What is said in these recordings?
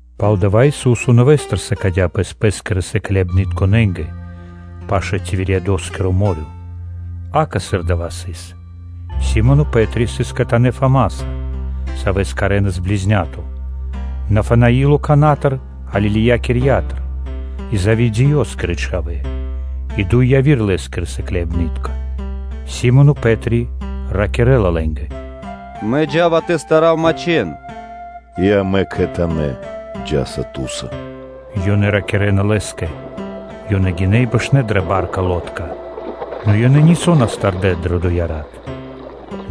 Пало́ дава́ Ису́со нэвэ́стыр сыкадя́ Пэс Пэ́скирэ сыкляибнытконэ́нгэ пашы́л Тивериадоскиро мо́рё (дэрья́в). Акэ, сыр дава́ сыс: Си́моно Пэ́три сыс кхэтанэ́ Фамаса, Савэс кхарэнас “Близняко”, Нафанаило Канатыр Галилеякирьятыр, и Зеведеёскирэ чхавэ́, и дуй яви́р Лэ́скирэ сыкляибны́тка. Си́моно Пэ́три ракирэ́ла лэ́нгэ: “Мэ джа́ва тэ старав мачхэн.” “И амэ кхэтанэ́ джа́са ту́са”, – ёнэ ракирэ́на лэ́скэ. Ёнэ гинэ́ и бэшнэ́ дрэ ба́рка, нэ ёнэ нисо́ на стардэ дрэ доя́ рат.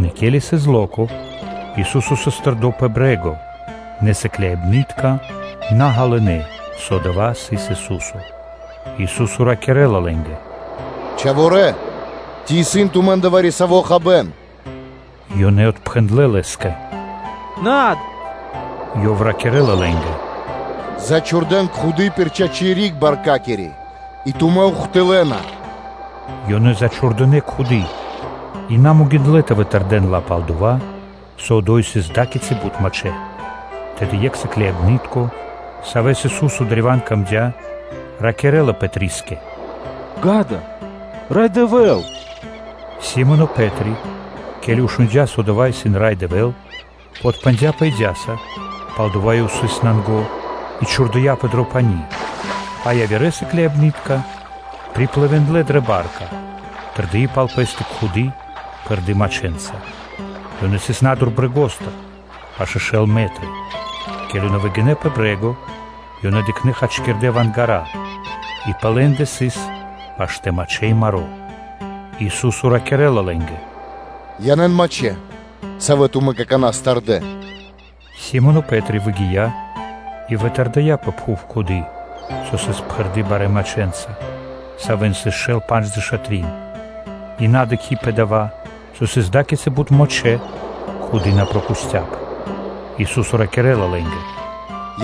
Нэ ке́ли сыс тасярла, Ису́со сыс тэрдо́ пэ брэ́го; нэ сыкляибны́тка на ґалынэ́, со дава́ сыс Ису́со. Ису́со ракирэ́ла лэ́нгэ: “Тэрнэ́ Мануша́лэ! Ци исын тумэ́ндэ вари-саво́ хабэ́н?” Ёнэ отпхэндлэ́ Лэ́скэ: “Над.” Ёв ракирэ́ла лэ́нгэ: “Зачхурдэн кхуды́ (сетка) пир чачи́ риг баркакири и тумэ́ ухтылэна.” Ёнэ зачхурдынэ кхуды́, и на могиндлэ́ тэ вытырдэн ла, пал-дова́ со одо́й сыс ада́кицы бут мачхэ́. Тэды екх сыкляибны́тко, саво́ сыс дро́го Исусо́скэ, ракирэ́ла Пэтрискэ: “Ѓа́да, Рай Дэвэ́л.” Си́моно Пэ́три, ке́ли шундя́, со адава́ сыс Рай Дэвэ́л, ёв подпхандяпэ идяса, пал-дова́ со ёв сыс нанго, и чхурдыяпэ дро пани́; а явирэ сыкляибны́тка приплывиндлэ (дынэ плима адари́к) дрэ ба́рка, тырдыи пал пэ́стэ кхуды́ пхэрды́ мачхэнца. Ёнэ сыс на́дур брэгостыр пашэ́ шэл метры. Ке́ли ёнэ выгинэ́ пэ брэ́го, ёнэ дыкхнэ́ хачкирдэ́ вангара, и пэ лэ́ндэ сыс паштэ́ мачхэ́ и маро́. Ису́со ракирэ́ла лэ́нгэ: “Янэ́н мачхэ́, савэ́ тумэ́ какана́ стардэ.” Си́моно Пэ́три выгия́ и вытырдыя пэ пхув кхуды́ (сетка), со сыс пхэрды́ барэ́ мачхэнца, савэ́н сыс шэл пандждэша́ трин; и на дыкхи́ пэ дава́, со сыс ада́кицы бут мачхэ́, кхуды́ на прокусцяпэ. Ису́со ракирэ́ла лэ́нгэ: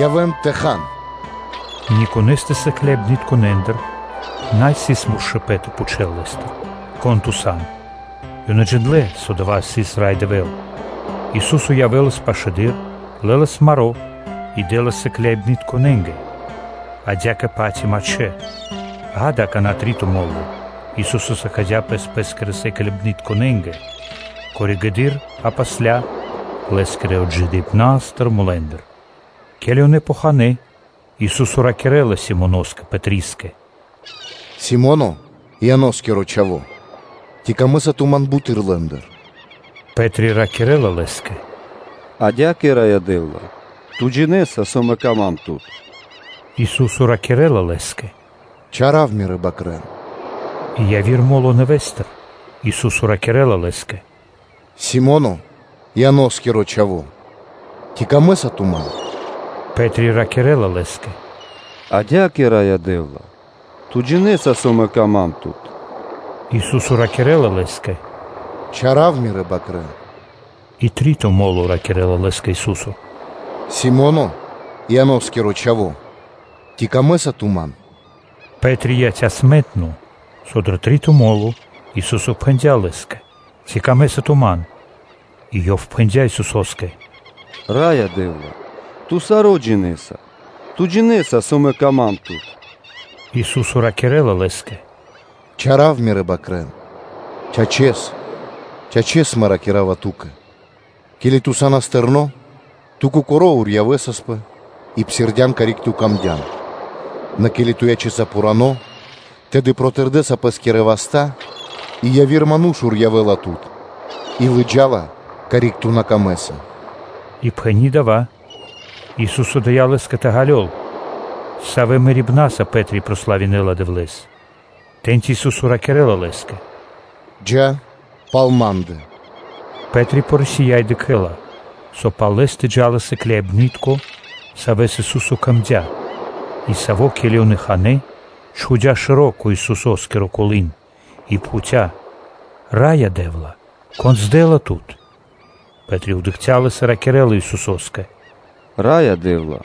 “Явэ́н тэ хан.” Никонэстэ сыкляибнытконэндыр на сыс муршкипэн тэ пхучэл Лэ́стыр: “Кон Ту сан?” Ёнэ джиндлэ́, со адава́ сыс Рай Дэвэ́л. Ису́со явэ́лас пашэдыр, лэлас маро́ и дэ́лас сыкляибнытконэ́нгэ, адя́кэ-паць и мачхэ́. Ѓа́да, акана́ три́то мо́ло Ису́со сыкадя́ Пэс Пэ́скирэ сыкляибнытконэ́нгэ, коригэды́р (позжэды́р) Лэ́скирэ отджидыипнастыр мулэ́ндыр. Ке́ли ёнэ ханэ́, Ису́со ракирэ́лас Симоноскэ Пэтрискэ: “Симоне, Ианоскиро Чхаво́! Ци сом Мэ дро́го ту́кэ бутэды́р лэ́ндыр?” Пэ́три ракирэ́ла Лэ́скэ: “Адя́кэ, Раё Дэ́вла! Ту джинэ́са, со Ту сан дро́го Ма́нгэ.” Ису́со ракирэ́ла лэ́скэ: “Чара́в Мирэ́ свэнтонэ́ бакрорэ́н.” И яви́р мо́ло нэвэ́стыр Ису́со ракирэ́ла лэ́скэ: “Симоне, Ианоскиро Чхаво́! Ци сом Мэ дро́го ту́кэ?” Пэ́три ракирэ́ла Лэ́скэ: “Адя́кэ, Раё Дэ́вла!” Ту джинэ́са, со мэ Ту сан дро́го ма́нгэ.” Ису́со ракирэ́ла лэ́скэ: “Чара́в Мирэ́ бакрэ́н.” И три́то мо́ло ракирэ́ла лэ́скэ Ису́со: “Симоне, Ианоскиро чхаво́! Ци сом Мэ дро́го Ту́кэ?” Пэ́три яця́ смэнтно, со дро три́то мо́ло Ису́со пхэндя́ лэ́скэ: “Ци сом Мэ дро́го ту́кэ?”, и ёв пхэндя́ Исусо́скэ: “Раё Дэ́вла! Ту саро́ джинэ́са; Ту джинэ́са, со Ту сан дро́го ма́нгэ.” Ису́со ракирэ́ла лэ́скэ: “Чара́в Мирэ́ бакрэ́н. Чачэс, чачэс Мэ ракира́ва ту́кэ: ке́ли ту са́нас тэрно́, ту кокоро́ урьявэсаспэ и псирдян, карик ту камдян; нэ ке́ли ту ячэса пхурано́, тэды протырдэса пэ́скирэ васта́, и яви́р ману́ш урьявэла тут и лыджа́ла, карик ту на камэ́са.” И пхэни́ дава́, Ису́со дыя́ лэ́скэ тэ ґалёл, савэ́ мэрибнаса Пэ́три прославинэла Дэвлэ́с. Тэ́ньци Ису́со ракирэ́ла лэ́скэ: “Джа́ пал Ма́ндэ.” Пэ́три порисия и дыкхэ́ла, со пал лэ́стэ джа́ла сыкляибны́тко, савэ́скэ Ису́со сыкадя́ и саво́, ке́ли ёнэ ханэ́, чхудя́ шэро́ кэ Исусо́скиро колы́н и пхуця́: “Раё Дэ́вла! Кон здэла Тут?” Пэ́три дыкхця́ лэс и ракирэ́ла Исусо́скэ: “Раё Дэ́вла!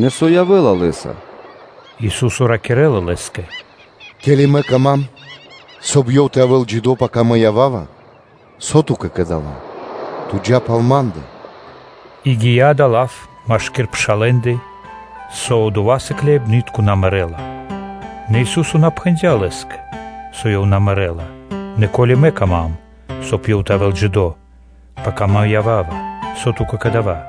Нэ со явэ́ла лэ́са? Ису́со ракирэ́ла лэ́скэ: “Ке́ли Мэ кама́м, соб (кай) ёв тэ явэ́л джидо́ пака Мэ ява́ва, со ту́кэ кэ дава́? Ту джа́ пал Ма́ндэ.” И гия́ дава́ лав машки́р пшалэ́ндэ, со одова́ сыкляибны́тко на мэрэ́ла. Нэ Ису́со на пхэндя́ лэ́скэ, со ёв на мэрэ́ла, нэ “Ко́ли Мэ кама́м, соб (кай) ёв тэ явэ́л джидо́, пака Мэ ява́ва, со ту́кэ кэ дава́?”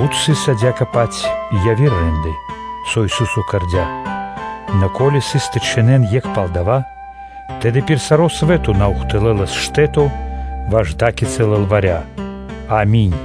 Бут сыс адя́кэ-паць и яви́р рэ́нды (де́лы), со Ису́со кэрдя́: нэ, ко́ли сыс тэ чхинэн екх пал дава́, тэды пир саро́ свэ́то на ухтылэлас (на́доси) штэ́то ваш ада́кицы лылваря. Ами́нь.